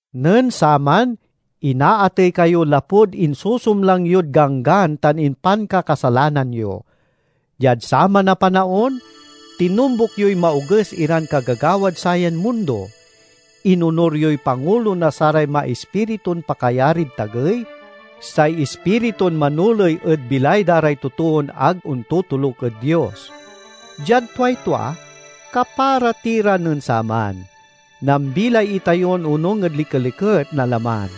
Nen saman inaatey kayo lapud insusumlang yod ganggan tan impankakasalanan yo. Diad saman a panaon tinombuk yoy maoges iran kagagawad sayan mundo; inonur yoy pangulo na saray maispiritun pakayarid tagey, say ispiritun manoley ed bilay da ray totoon ag ontotoluk ed Dios. Diad tuay tua kapara ti ra nen saman; nambilay itayo onung ed likeliket na laman,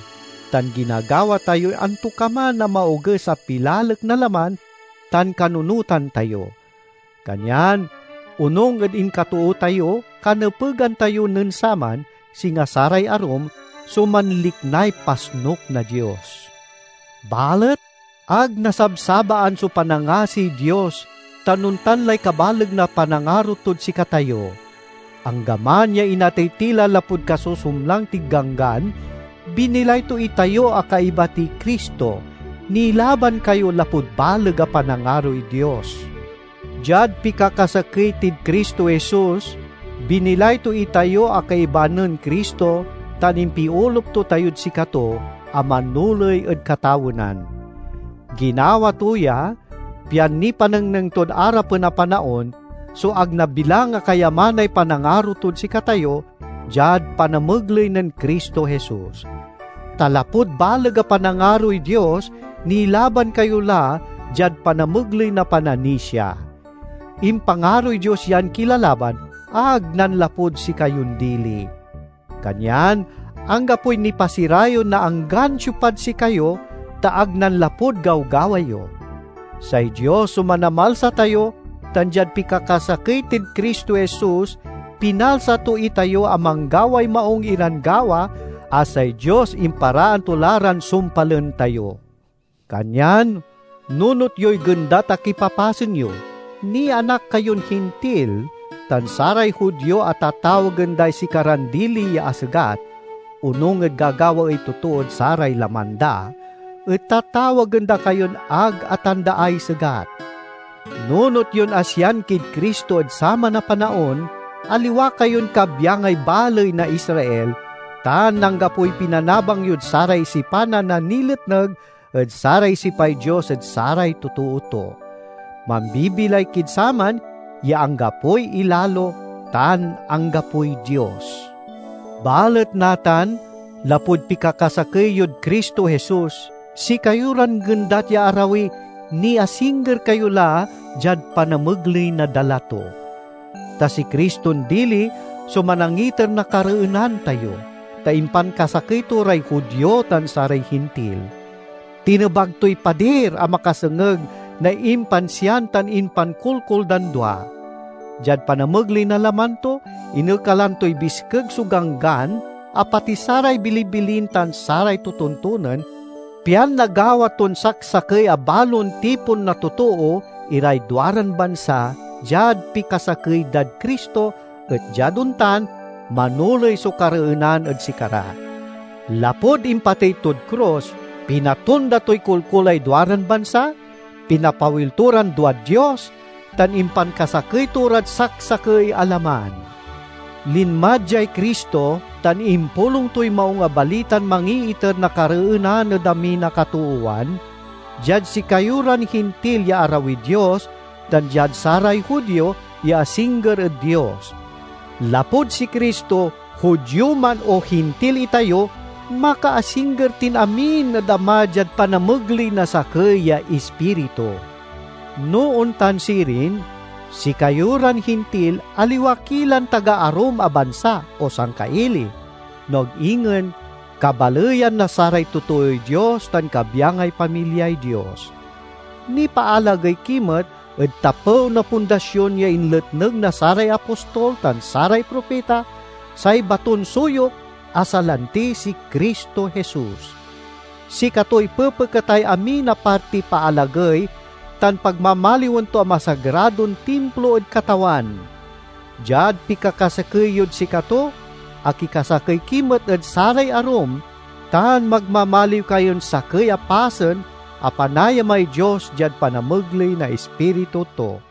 tan ginagawa tayoy antokaman a maoges a pilalek na laman tan kanunotan tayo. Kanyan onung ed inkatoo tayo kanepegan tayo nen saman, singa saray arum, so manliknay pasnuk na Dios. Balet ag nasabsabaan so panangasiy Dios tan ontan lay kabaleg na panangaro tod sikatayo. Anggaman ya inatey ti la lapud kasusumlang tid ganggan, binilay to itayo a kaiba tiy Cristo. Nilaban kayo lapud baleg a panangaroy Dios. Diad pikakasakey tid Cristo Jesus, binilay to itayo a kaiba nen Cristo tan impiolup to tayod sikato a manoley ed katawenan. Ginawa to ya pian nipanengneng tod arapen a panaon so ag nabilang a kayamanay panangaro tod sikatayo, diad panamegley nen Cristo Jesus. Ta lapud baleg a panangaroy Dios nilaban kayo la diad panamegley na pananisia. Impangaroy Dios yan kilalaban, ag nanlapud sikayon dili. Kanyan anggapoy nipasirayew na anggan siopad sikayo, ta ag nanlapud gawgawa yo. Say Dios so Manamalsa tayo, tan diad pikakasakey tid Cristo Jesus pinalsa to itayo a manggaway maung iran gawa a say Dios imparaan to la ran sumpalen tayo. Kanyan nunot yoy gendat a kipapasen yo: nianak kayon Hintil, tan saray Judio a tatawagen day sikaran dili ya asegat, (onung ed gagawaey totood saray laman da) et tatawagen da kayon ag atandaay segat. Nunot yon asian kid Cristo ed saman a panaon, aliwa kayon kabyangay baley na Israel, tan anggapoy pinanabang yod saray sipanan a niletneg ed saray sipay Dios ed saray totoo to. Mambibilay kid saman ya anggapoy ilalo tan anggapoy Dios. Balet natan, lapud pikakasakey yod Cristo Jesus, sikayo ran gendat ya arawi, niasingger kayo la diad panamegley na dala to. Ta si Criston dili so manangiter na kareenan tayo, ta impankasakey to ray Judio tan saray Hintil. Tinebag toy padir a makasengeg na impansian tan impankolkol dan dua. Diad panamegley na laman to, inekalan toy biskeg so Ganggan a pati saray bilibilin tan saray totontonen, pian nagawa ton saksakey a balon tipon na totoo iray duaran bansa diad pikasakey dad Cristo, et diad ontan manoley so kareenan ed sikara. Lapud impatey tod krus, pinatonda toy kolkolay duaran bansa, pinapawil to ran duad Dios, tan impankasakey to rad saksakey a laman. Linma diay Cristo tan impulong toy Maung a Balitan mangiiter na kareenan ed amin a katoowan—diad sikayo ran Hintil ya arawid Dios, tan diad saray Judio, ya asingger ed Dios. Lapud si Cristo, Judio man o Hintil itayo, makaasingger tin amin ed Ama diad panamegley na sakey ya Ispiritu. No ontan sirin, sikayo ran Hintil, aliwa ki lan taga arum a bansa o sangkaili, no ag ingen kabaleyan na saray totooy Dios tan kabyangay pamilyay Dios! Nipaalagey ki met ed tapew na pundasion ya inletneg na saray apostol tan saray propita, say baton suyok, a salanti si Cristo Jesus. Sikatoy pepeketay amin a partiy paalagey tan pagmamaliwen to a masagradon Timplo ed Katawan. Diad pikakasakey yod sikato, akikasakey ki met ed saray arum, tan magmamaliw kayon sakey a pasen a panayamay Dios diad panamegley na Ispiritu to.